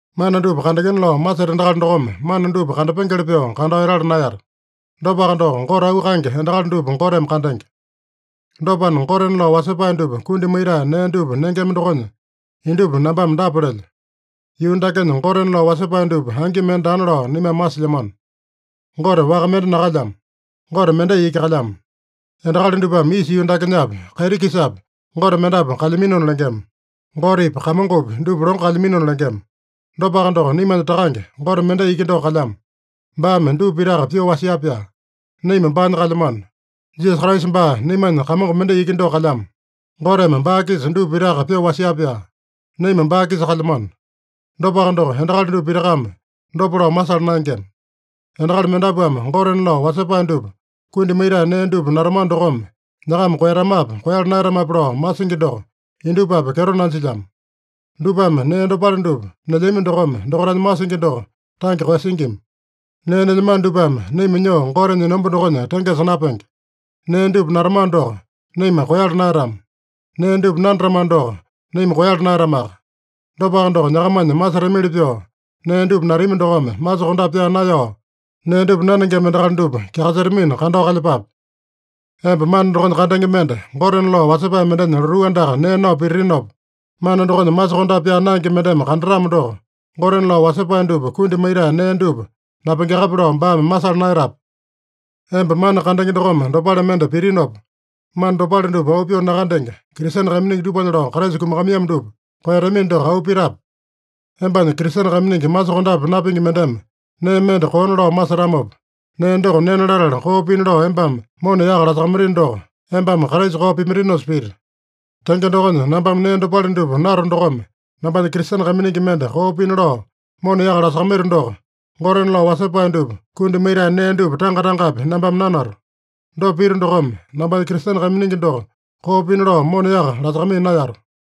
Mana dupa kandengena lao maseta endakali dokome, mana dupa kandapengeli pyoo kandao etala naeyata. Dopaka doko, Gote auu kaenge endakali dupa Goteme kandenge. Dopana, gotena lao wasepae dupa kundi maitae nee dupa nengema dokonya, indupa nambame dapa lelyo: Yuu dakenya gotena lao wasepae dupa angi mende daana lao naimame masilyamano. Gote waka mende nakalyamo. Gote mendai iki kalyamo. Endakali dupame isa yuu dakenyapi, kaiti-kisapi gote mendapu kalyaminona lengema. (Gotepi, kamongopi dupa longo kalyaminona lengema.) Dopaka doko, naimanya Takange, Gote mendai iki doko kalyamo. Baame dupa pitaka pyoo wasia-pyaa. Naima baanya kalyamano. Jisasa Kraisa baa naimanya Kamongo mendai iki doko kalyamo. Goteme baa-kisa dupa pitaka pyoo wasia-pyaa. Naima baa-kisa kalyamano. Dopaka doko, endakali dupa pitakame dopa lao masala naengema. Endakali mendapuame gotena lao wasepae dupa kundi maitae nee dupa natamano dokome nyakama koeyatamape, koeyala naeyatamape lao masingi doko indupapi kyeto nanjilyamo. Dupame nee dopale dupa nelyami dokome, dokaitanya masingi doko tange koeyasingima. Nee nelyamano dupame naima nyoo Gotenya enomba dokonya tengesa napenge. Nee dupa natamano doko, naima koeyala naeyatama. Nee dupa nanatamano doko, naima koeyala naeyatamaka. Dopaka doko, nyakamanya masetamili pyoo nee dupa natami dokome, masokondape pyaa naeyao nee dupa nanengema endakali dupa kyakasetamina, kandao kalyepape. Emba mana dokonya kandenge mende, gotena lao wasepae mendenya lotuu andaka nee nao pititinopa, mana dokonya masokondape pyaa naenge mendeme kandatamo doko, gotena lao wasepae dupa kundi maitae nee dupa napengeakape lao baame masala naeyatape? Emba mana kandenge dokome dopale mende pitinopa, mana dopale dupa auu pyoo nakandenge, Kristene kaiminingi dupanya lao Kraisa kumakamaiyamo dupa koeyatamino doko auu pitape? Embanya Kristene kaiminingi masokondape napingi mendeme nee mende koona lao masetamopa, nee doko nena latala koo pina lao embame mona yaka lasakamaitino doko, embame Kraisa koo pimaitinosa pita. Tenge dokonya, nambame nee dopale dupa nato dokome, nambanya Kristene kaiminingi mende koo pina lao mona yaka lasakamaito doko, gotena lao wasepae dupa kundi maitae nee dupa tanga-tangapi nambame nanato. Dopa pito dokome, nambanya Kristene kaiminingi doko koo pina lao mona yaka lasakamaiya naeyato.